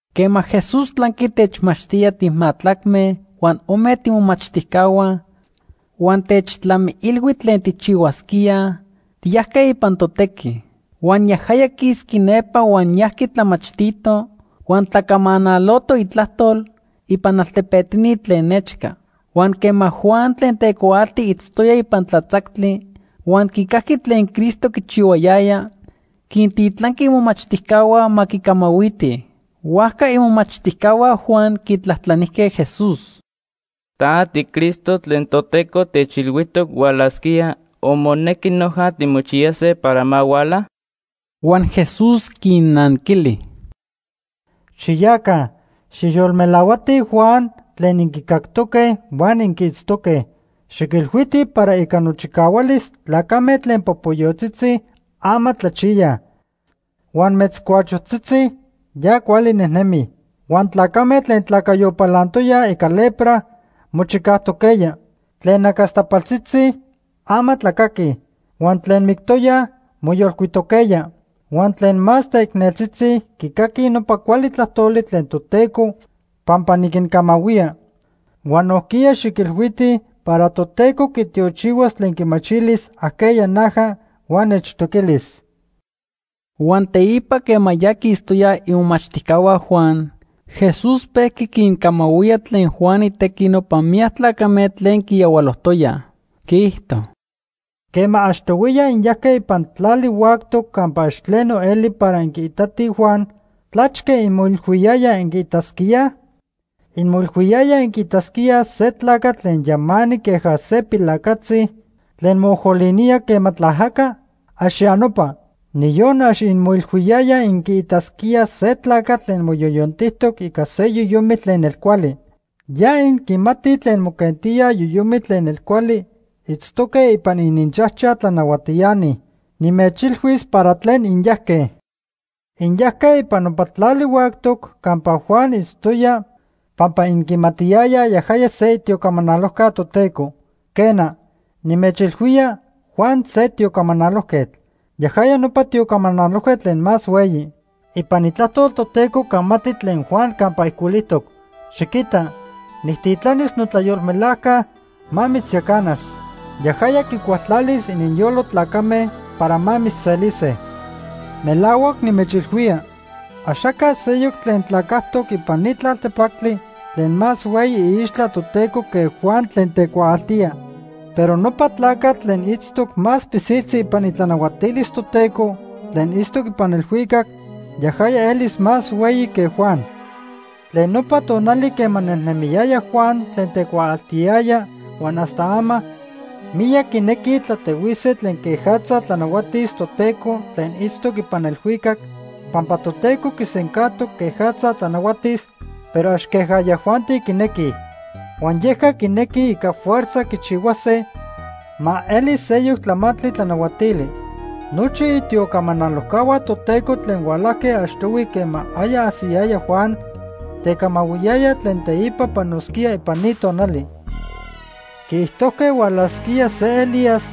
Quema Jesús tlanqui techmachtía timajtlacme huan ome tiimomachtijcahua huan techtlamiilhui tlen tijchihuasquíaj, tiyajque ipan totequi. Huan yajaya quisqui nepa huan yajqui tlamachtito huan tlacamanaloto itlajtol ipan altepetini tlen nechca. Huan quema Juan tlen tecuaalti itztoya ipan tlatzactli huan quicajqui tlen Cristo quichihuayaya, quintitlanqui imomachtijcahua ma quicamahuitij. Huajca imomachtijcahua Juan quitlajtlanijque Jesús: ―¿Ta tiCristo tlen Toteco techilhuijtoc hualasquía o monequi noja timochiyase para ma huala? Huan Jesús quinnanquili: “Xiyaca, xijyolmelahuatij Juan tlen inquicactoque huan inquiitztoque. Xiquilhuitij para ica nochicahualis, tlacame tlen popoyotzitzi, ama tlachiyaj. Huan metzcuachotzitzi, ya cuali nejnemij. Huan tlacame tlen tlacayo palantoyaj ica lepra, mochicajtoquejya. Tlen nacastapaltzitzi, ama tlacaquij. Huan tlen mictoyaj, moyolcuitoquejya. Huan tlen más teicneltzitzi quicaquij nopa cuali tlajtoli tlen Toteco pampa niquincamahuía. Huan nojquiya xiquilhuitij para Toteco quitiochihuas tlen quimachilis ajqueya naja huan nechtoquilis.” Huan teipa quema ya quistoyaj imomachtijcahua Juan, Jesús pejqui quincamahuía tlen Juan itequi nopa miyac tlacame tlen quiyahualojtoyaj. Quiijto: “Quema achtohuiya inyajque ipan tlali huactoc campa ax tleno eli para inquiitatij Juan, ¿tlachque inmoilhuiyayaj inquiitasquíaj? ¿Inmoilhuiyayaj inquiitasquíaj se tlacatl tlen yamanic queja se pilacatzi tlen moojolinía quema tlaajaca? ¡Ax ya nopa! Niyon ax inmoilhuiyayaj inquiitasquíaj se tlacatl tlen moyoyontijtoc ica se yoyomitl tlen nelcuali. Ya inquimatij tlen moquentíaj yoyomitl tlen nelcuali itztoque ipan ininchajchaj tlanahuatiani. Nimechilhuis para tlen inyajque. Inyajque ipan nopa tlali huactoc campa Juan itztoya pampa inquimatiyayaj yajaya se itiocamanalojca Toteco. Quena, nimechilhuía Juan se tiocamanalojquetl. Yajaya nopa tiocamanalojquetl tlen más hueyi. Ipan Itlajtol Toteco camati tlen Juan campa ijcuilijtoc: ‘Xiquita, nijtitlanis notlayolmelajca ma mitzyacanas. Yajaya quicualtlalis ininyolo tlacame para ma mitzselise.’ Melahuac nimechilhuía, axaca seyoc tlen tlacajtoc ipan ni tlaltepactli tlen más hueyi iixtla Toteco que Juan tlen tecuaaltía. Pero nopa tlacatl tlen itztoc más pilsiltzi ipan itlanahuatilis Toteco tlen itztoc ipan elhuicac, yajaya elis más hueyi que Juan. “Tlen nopa tonali quema nejnemiyaya Juan tlen tecuaaltiyaya huan hasta ama, miyac quinequij tlatehuise tlen quejatza tlanahuatis Toteco tlen itztoc ipan elhuicac, pampa Toteco quisencajtoc quejatza tlanahuatis, pero ax queja yajuanti quinequij. Huan yeca quinequij ica fuerza quichihuase ma eli seyoc tlamantli tlanahuatili. Nochi itiocamanalojcahua Toteco tlen hualajque achtohui quema aya ajsiyaya Juan, tecamahuiyayaj tlen teipa panosquía ipan ni tonali. Quiijtojque hualasquía se Elías,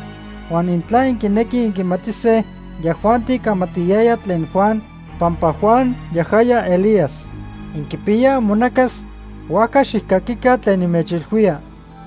huan intla inquinequij inquimatise, yajuanti camatiyayaj tlen Juan, pampa Juan yajaya Elías. Inquipiyaj imonacas, huajca xijcaquica tlen nimechilhuía.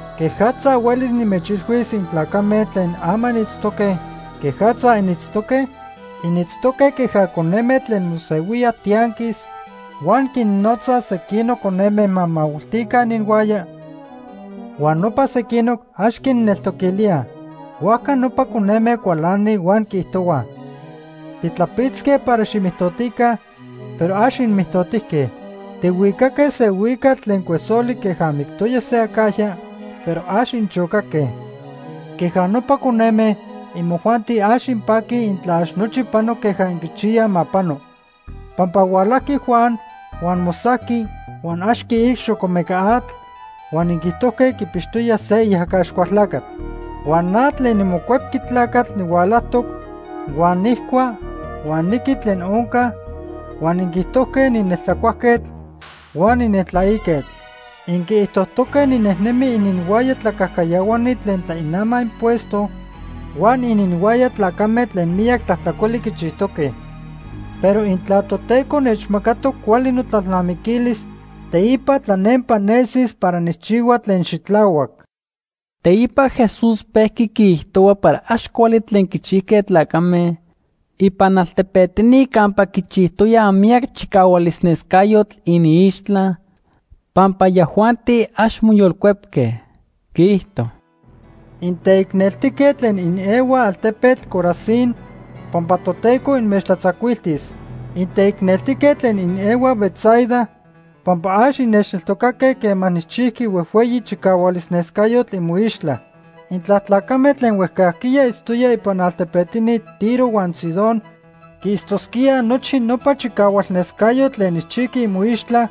“¿Quejatza huelis nimechilhuis intlacame tlen ama initztoque quejatza initztoque? Initztoque queja coneme tlen mosehuíaj tianquis huan quinnotzaj sequinoc coneme ma mahuilticaj ininhuaya huan nopa sequinoc ax quinneltoquilíaj. Huajca nopa coneme cualanij huan quiijtohuaj: ‘Titlapitzque para ximijtotica, pero ax inmijtotijque. Tihuicaque se huicatl tlen cuesoli queja mictoya se acajya, pero ax inchocaque.’ Queja nopa coneme, imojuanti ax inpaquij intla ax nochi pano queja inquichiyaj ma pano. Pampa hualajqui Juan huan mosajqui huan ax quiic xocomeca atl huan inquiijtojque quipixtoya se iajaca Axcualtlacatl. Huan na tlen niMocuepqui Tlacatl nihualajtoc, huan nijcua huan niqui tlen onca; huan inquiijtojque nineltlacuajquetl huan nineltlaiquetl. Inquiijtojtoque ninejnemi ininhuaya tlacajcayahuani tlen tlainamaj impuesto huan ininhuaya tlacame tlen miyac tlajtlacoli quichijtoque. Pero intla Toteco nechmacatoc cuali notlalnamiquilis, teipa tlanempa nesis para nijchihua tlen xitlahuac.” Teipa Jesús pejqui quiijtohua para ax cuali tlen quichijque tlacame ipan altepetini campa quichijtoya miyac chicahualnescayotl iniixtla, pampa yajuanti ax moyolcuepque. Quiijto: “Inteicneltique tlen inehuaj altepetl Corazín pampa Toteco inmechtlatzacuiltis. Inteicneltique tlen inehuaj Betsaida, pampa ax innechneltocaque quema nijchijqui huejhueyi chicahualnescayotl imoixtla. Intla tlacame tlen huejcajquiya itztoyaj ipan altepetini Tiro huan Sidón quiitztosquíaj nochi nopa chicahualnescayotl tlen nijchijqui imoixtla,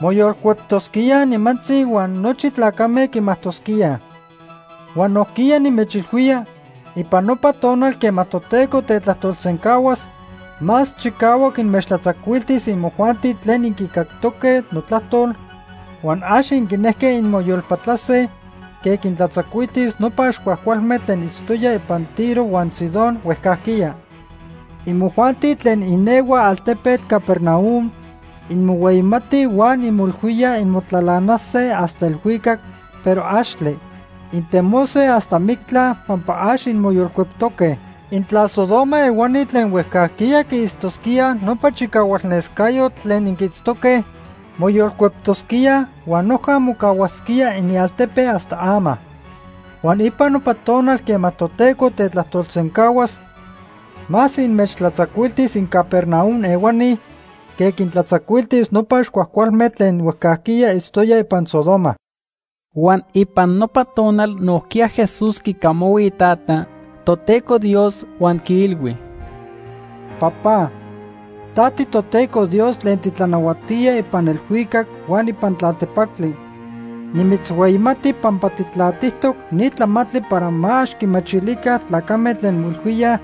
moyolcueptosquíaj nimantzi huan nochi tlacame quimajtosquíaj. Huan nojquiya nimechilhuía, ipan nopa tonal quema Toteco tetlajtolsencahuas, más chicahuac inmechtlatzacuiltis imojuanti tlen inquicactoque notlajtol huan ax inquinejque inmoyolpatlase, que quintlatzacuiltis nopa ax cuajcualme tlen itztoyaj ipan Tiro huan Sidón huejcajquiya. Imojuanti tlen inehuaj altepetl Capernaum, inmohueyimatij huan inmoilhuíaj inmotlalanase hasta elhuicac, pero axtle. Intemose hasta mictla pampa ax inmoyolcueptoque. Intla Sodoma ehuani tlen huejcajquiya quiitztosquíaj nopa chicahualnescayotl tlen inquiitztoque, moyolcueptosquíaj huan noja mocahuasquía inialtepe hasta ama. Huan ipan nopa tonal quema Toteco tetlajtolsencahuas, más inmechtlatzacuiltis inCapernaum ehuani que quintlatzacuiltis nopa ax cuajcualme tlen huejcajquiya itztoyaj ipan Sodoma.” Huan ipan nopa tonal nojquiya Jesús quicamahui Itata, Toteco Dios, huan quiilhui: “Papá, ta tiToteco Dios tlen titlanahuatía ipan elhuicac huan ipan tlaltepactli. Nimitzhueyimati pampa tijtlatijtoc ni tlamantli para ma ax quimachilica tlacame tlen moilhuíaj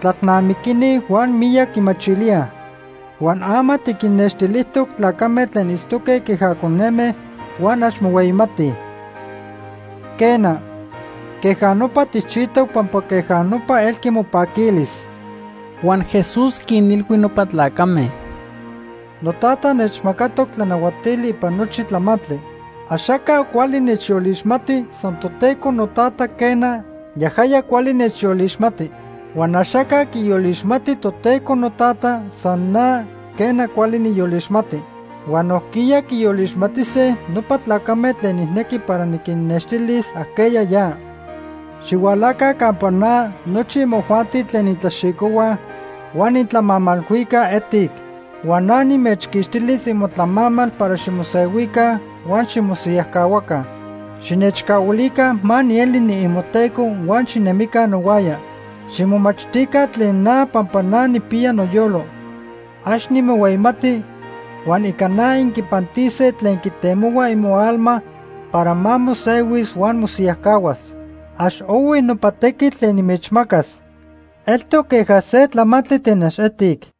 tlalnamiquini huan miyac quimachilíaj. Huan ama tiquinnextilijtoc tlacame tlen itztoque queja coneme huan ax mohueyimatij. Quena, queja nopa tijchijtoc pampa queja nopa elqui mopaquilis.” Huan Jesús quinilhui nopa tlacame: “NoTata nechmacatoc tlanahuatili ipan nochi tlamantli. Axaca cuali nechyolixmati, san Toteco noTata, quena, yajaya cuali nechyolixmati. Huan axaca quiyolixmati Toteco noTata, san na, quena, cuali nijyolixmati. Huan nojquiya quiyolixmatise nopa tlacame tlen nijnequi para niquinnextilis ajqueya ya. Xihualaca campa na nochi imojuanti tlen intlaxicohuaj huan intlamamalhuicaj etic, huan na nimechquixtilis imotlamamal para ximosehuica huan ximosiyajcahuaca. Xinechcahuilica ma nieli niimoTeco huan xinemica nohuaya. Ximomachtica tlen na pampa na nijpiya noyolo. Ax nimohueyimati huan ica na inquipantise tlen quitemohua imoalma para ma mosehuis huan mosiyajcahuas. Ax ohui nopa tequitl tlen nimechmacas. Eltoc queja se tlamamali tlen ax etic.”